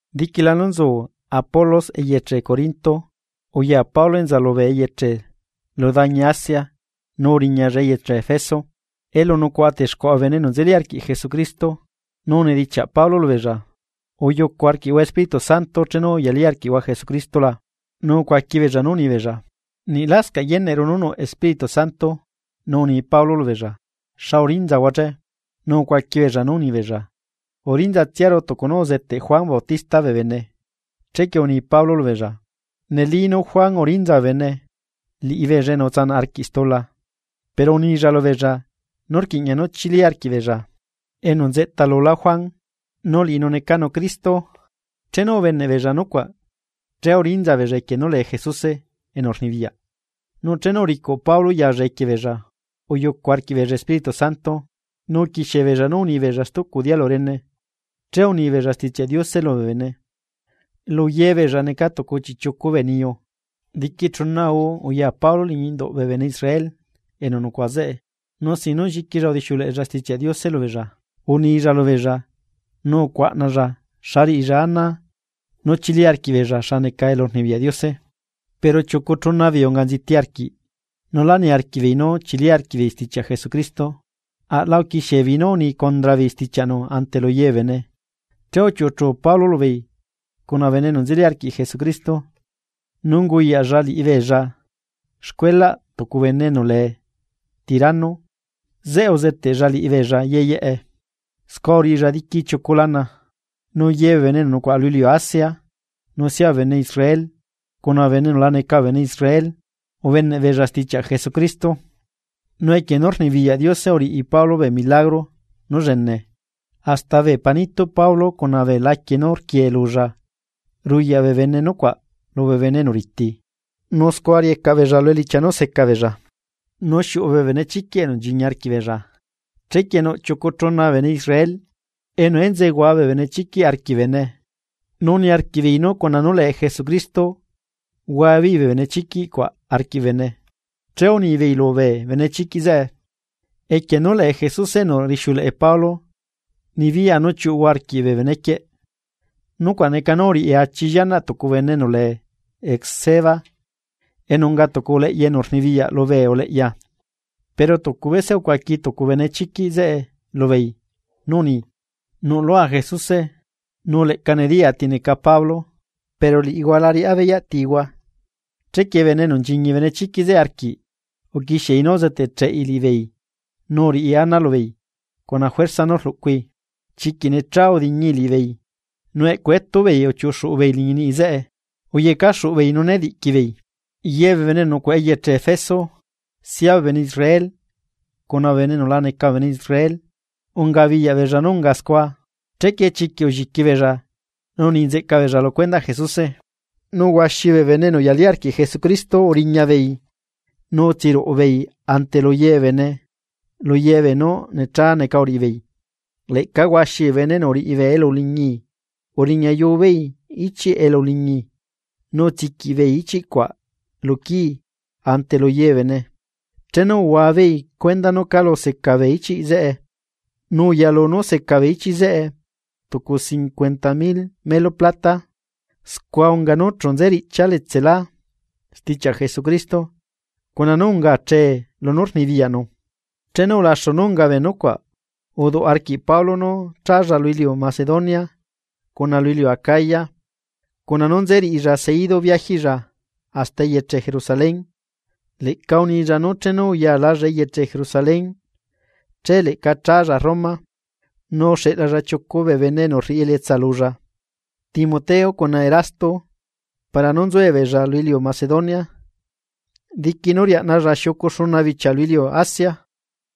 Diquila nú nzucu Apolos eyeche Corinto, uya Pablo enza lubee eyeche lu dañi Asia nu uriñalla eyeche Efeso, elu nucuaꞌa texcuaꞌa bee bene enu nzeli arquiꞌ Jesucristo. Nu unidichiaꞌ Pablo lubeella: ―¿Uyucu arquiꞌhua Espíritu Santo chenu uyalí arquiꞌhua Jesucristo la? Nu ucuaqui beella nú unibeella: ―Niꞌ lascaꞌ yeneꞌru nú nuꞌ Espíritu Santo. Nu uni Pablo lubeella: ―¿Xa urinzahua che? Nu ucuaqui beella nú unibeella: ―Urinzatsiaru tucu nú uzeteꞌ Juan Bautista bee bene. Chequie uni Pablo lubeella: ―Nelí nú Juan urinza bee bene, liꞌibeella enu utsanaꞌ arquiꞌ stula, pero unilla lubeella nú rquiꞌña nú chili arquiꞌbeella enu nzeꞌta lulá Juan, nu liꞌinu necanu Cristo. Chenu ubeneꞌbeella nucuaꞌ, che urinza beella equie nú lee Jesuse enu rnibiyaꞌ, nu chenu uricuꞌ Pablo yalla equie beella, uyucu arquiꞌbeella Espíritu Santo, nu uquiexie beella nú unibeella stucu dialu rene, che unibeella Stichiaꞌ Diose lubee bene. Lu yebeella neca tucu chiꞌchiucu bee niyu. Diqui chuna guu uya Pablo liñi induꞌ bee bene Israel enu nucuaꞌa zeꞌe, nu sin nú lliquilla udixiuleꞌella Stichiaꞌ Diose lubeella, unilla lubeella nu ucuaꞌnalla xa riꞌilla ana nú chili arquiꞌbeella xa neca elurnibiyaꞌ Diose. Pero chiucu chuna beei unga nziti arquiꞌ nu lá niarquiꞌbeei nú achili arquiꞌbeei stichiaꞌ Jesucristo, aꞌla uquixiebeei nú uni condra beei stichiaꞌnu ante lu ye bee bene. Che uchiuꞌuchu Pablo lubeei cuna bee bene enu nzeli arquiꞌ Jesucristo, nu unguyaꞌlla liꞌibeella xcuelaꞌ tucu bene enu lee Tirano, zeꞌe uzeteꞌlla liꞌibeella yeyeꞌe, scua uriꞌilla diqui chiucu lana. Nu ye bee bene enu nucuaꞌa lu iliu Asia nu sia bee bene Israel cuna bee bene enu la neca bee bene Israel ubeneꞌbeella stichiaꞌ Jesucristo. Nu equie nú rnibiyaꞌ Diose uriꞌi Pablo bee milagro nú llene, hasta bee panituꞌ Pablo cuna bee laquie nú rquiee lulla ruyaꞌ bee bene nucuaꞌ lubee bene enu riti, nu scua riecaꞌ beella lu elichia nú secabeella, nu xiuꞌu bee benechiquiꞌ enu nchiñi arquiꞌbeella. Chequie nuꞌ chiucu chuna bee bene Israel enu enzeehua bee benechiquiꞌ arquiꞌ bee bene, nu niarquiꞌbeei nú cuna nú lee Jesucristo huabeei bee benechiquiꞌ cuaꞌ arquiꞌ bee bene, che unibeei lubee benechiquiꞌ zeꞌe: ―Equie nú lee Jesuse enu rixiuleꞌe Pablo nibiyaꞌa nú chiuꞌuhua arquiꞌ bee benequieꞌ. Nucuaꞌ neca nú uriꞌi achi llianaꞌ tucu bene enu lee Esceva, enu unga tucu uleꞌya enu rnibiyaꞌ lubee uleꞌya. Pero tucu bese ucuaqui tucu bee benechiquiꞌ zeꞌe lubeei nú uni: ―Nuꞌlua Jesuse, nu leꞌca nediyaa ti neca Pablo, pero liꞌihua la riꞌá beyaꞌ tihua. Chequie bene enu nchiñi benechiquiꞌ zeꞌe arquiꞌ uquixiei nú uzeteꞌcheꞌi liꞌibeei nu uriꞌi ana lubeei cuna juerza nú rluꞌcui, chiquiꞌ necha udiñii liꞌibeei, nu eꞌcu etubeei uchiuꞌuxuꞌubeei liñi niꞌi zeꞌe uyecaxuꞌubeei nu nediꞌqui beei. Ye bee bene enu nucuaꞌa eyeche Efeso, sia bee bene Israel cuna bee bene enu la neca bee bene Israel, ungabiyaꞌ beella nú ungae scua. Chequie chiquiꞌ ulliqui beella nu uni nzeꞌca beella lu cuendaꞌ Jesuse. Nu huaxi bee bene enu uyalí arquiꞌ Jesucristo uriña beei nu utsiruꞌu beei ante lu ye bee bene lu ye beenú necha neca uriꞌibeei. Leꞌca huaxi bee bene enu uriꞌi bee elu uliñi uriñayu beei ichiꞌ elu uliñi nu utsiquiꞌ beei ichiꞌ cuaꞌ lu quii ante lu ye bee bene. Chenu uhuabeei cuenda nú calu seca bee ichiꞌ zeꞌe, nu uyalu nú seca bee ichiꞌ zeꞌe tucu cincuenta mil melu plata. Scua unga nú chu nze riꞌchia letselá stichiaꞌ Jesucristo cuna nú ungachee lunú neca poderꞌnu. Chenu ulaxu nú unga bee nucuaꞌ, uduꞌ arquiꞌ Pablo nú challa lu iliu Macedonia cuna lu iliu Acaya, cuna nú nze riꞌilla seidu biajiꞌlla hasta eyeche Jerusalén. Leꞌca unilla nú chenu uyalalla eyeche Jerusalén che leꞌca challa Roma. Nu uxeꞌlalla chiucu bee bene enu rriꞌi elietsa lulla, Timoteo cuna Erasto para nú nzuebeella lu iliu Macedonia diqui nú riaꞌnalla xiucu xuna bichia lu iliu Asia.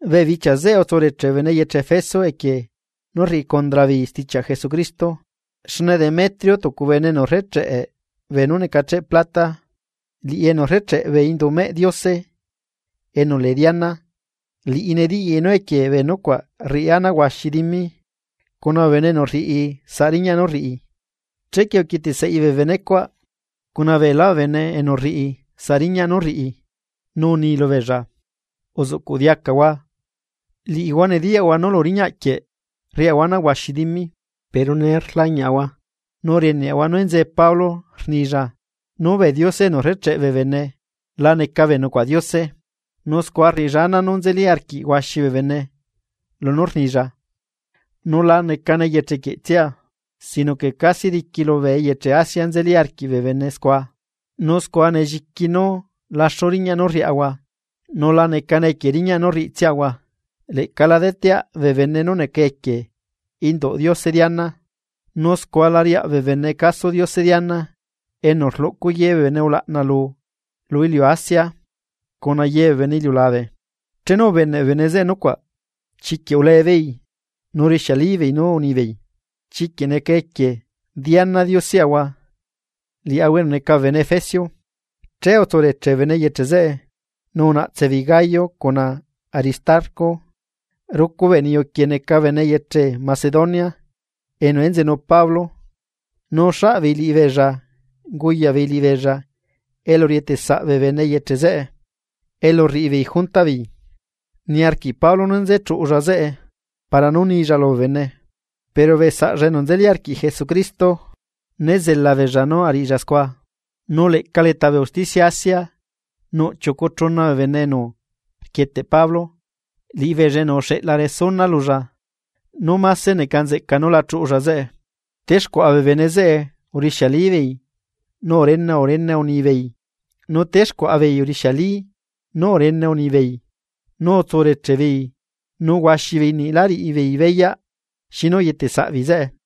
Bee bichia zeꞌe utsureche bee bene eyeche Efeso equie nú rriꞌi condra beei stichiaꞌ Jesucristo. Xne Demetrio tucu bene enu rrecheꞌe beenú necacheꞌ plata, liꞌi enu rrecheꞌe bee indumeꞌ diose enu lee Diana, liꞌi nediyaꞌi nú equie bee nucuaꞌ rriꞌi ana huaxi dimi cuna bee bene enu rriꞌi saꞌ riñaꞌ nú rriꞌi. Chequie uquieteꞌ saꞌi bee benecuaꞌ, cuna beelá bee bene enu rriꞌi saꞌ riñaꞌ nú rriꞌi, nu uni lubeella: ―Uzuꞌcuꞌ diacahua, liꞌihua nediyaꞌhua nú lu riñaꞌ quieꞌ rriaꞌahua ana huaxi dimi, pero nee rlañiꞌahua nu rieneꞌahua nú enzee Pablo rnilla nú bee diose enu rrecheꞌe bee bene la neca bee nucuaꞌ diose. Nu scua rriꞌilla ana nú nzeli arquiꞌ huaxi bee bene lunú rnilla, nu lacane eyeche quieꞌtsia, sino que casi diqui lubee eyeche Asia nzeli arquiꞌ bee bene scua. Nu scua nelliqui nú laxu riñaꞌ nú rriaꞌahua, nu lacane equie riñaꞌ nú rriꞌitsiaꞌahua, leꞌca la deteaꞌ bee bene nú neca equie induꞌ diose Diana. Nu scua la riaꞌ bee bene caso diose Diana enu rluꞌcu ye bee bene ulaꞌna lu lu iliu Asia cuna ye bee bene iliulabe. Chenu ubeneꞌ bee bene zeꞌe nucuaꞌ, chiquiꞌ ulee beei nu rixiali beei nú unibeei: ―¡Chiquiꞌ neca equie Diana dioseꞌahua liaꞌahua enu neca bee bene efesio! Che utsureche bee bene eyeche zeꞌe, nu unaꞌtse beei Gayo cuna Aristarco, rucu bee niyu quieꞌ neca bene eyeche Macedonia enu enzenu Pablo, nu uxaꞌbeei liꞌibeella nu unguyaꞌbeei liꞌibeella elu rietesaꞌ bee bene eyeche zeꞌe, elu rriꞌibeei juntaꞌbeei. Niarquiꞌ Pablo nú nze chuꞌulla zeꞌe para nú nilla lubee bene, pero bee saꞌlla enu nzeli arquiꞌ Jesucristo né zela beella nú ariꞌilla scua. Nu leꞌca leta bee usticia Asia, nuꞌ chiucu chuna bee bene enu rquieteꞌ Pablo, liꞌibeella enu uxeꞌla resuna lulla nú máse neca nzeꞌca nú la chuꞌulla zeꞌe. Texcuaꞌa bee bene zeꞌe urixialibeei nu urene urene unibeei, nu texcuaꞌa beei urixiali nu urene unibeei nu utsureche beei nu huaxi beei niꞌ la riꞌi beei beyaꞌ xinu uyeteꞌ saꞌbeei zeꞌe.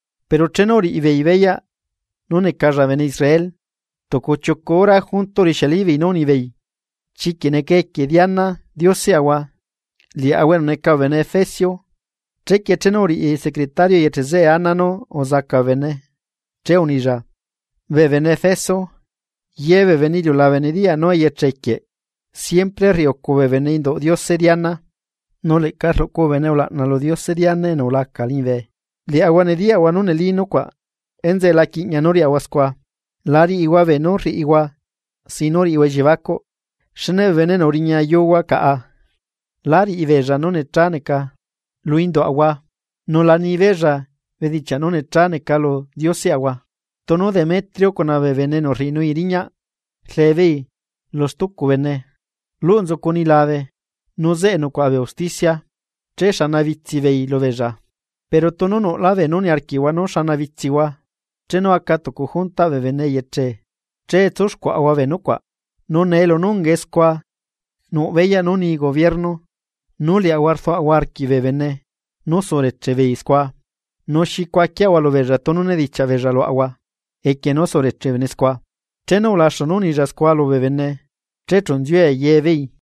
Pero chenu uriꞌibeei beyaꞌ nú necalla bene Israel, tucu chiucu hora junto urixialibeei nú unibeei: ―¡Chiquiꞌ neca equie Diana dioseꞌahua liaꞌahua enu neca bee bene efesio! Chequie chenu uriꞌi secretario eyeche zeꞌe ana nú uzaca bee bene, che unilla: ―Bee bene Efeso, ye bee bene iliulabe nediyaꞌ nú eyeche quieꞌ siempre rriucu bee bene induꞌ diose Diana, nu leꞌca rluꞌcu bee bene ulaꞌna lu diose Diana enu ulaca liñibe. Liꞌihua nediyaꞌhua nú neli nucuaꞌ. Enzeꞌe la quiꞌña nú riꞌihua scua, la riꞌihua beenú rriꞌihua sin nú riꞌihua elliebacuꞌ. Xne bee bene enu uriñayuhua caꞌa, lá riꞌibeella nú necha neca lu induaꞌahua, nu la ni beella bedichiaꞌ nú necha neca lu dioseꞌahua. Tunu Demetrio cuna bee bene enu rriꞌinui riñaꞌ rlee beei lu stucu bene, luꞌ nzucu nilabe nu zeꞌe nucuaꞌa bee usticia, chexana bitsi beei lubeella. Pero tunu nuꞌlá bee nú niarquiꞌhua nú xana bitsihua, chenu aca tucu juntaꞌ bee bene eyeche che tsuxcuaꞌa bee nucuaꞌ. Nu nee lunú ungae scua nuꞌ beyaꞌ nú ni gobierno nú liaꞌahua rduaꞌahua arquiꞌ bee bene nú sureche beei scua, ¿nu xi cuaquiaꞌahua lubeella tunu nedichiaꞌ beella luaꞌahua equie nú sureche bee bene scua? Chenu ulaxu nú unilla scua lubee bene che chu nziue ye beei.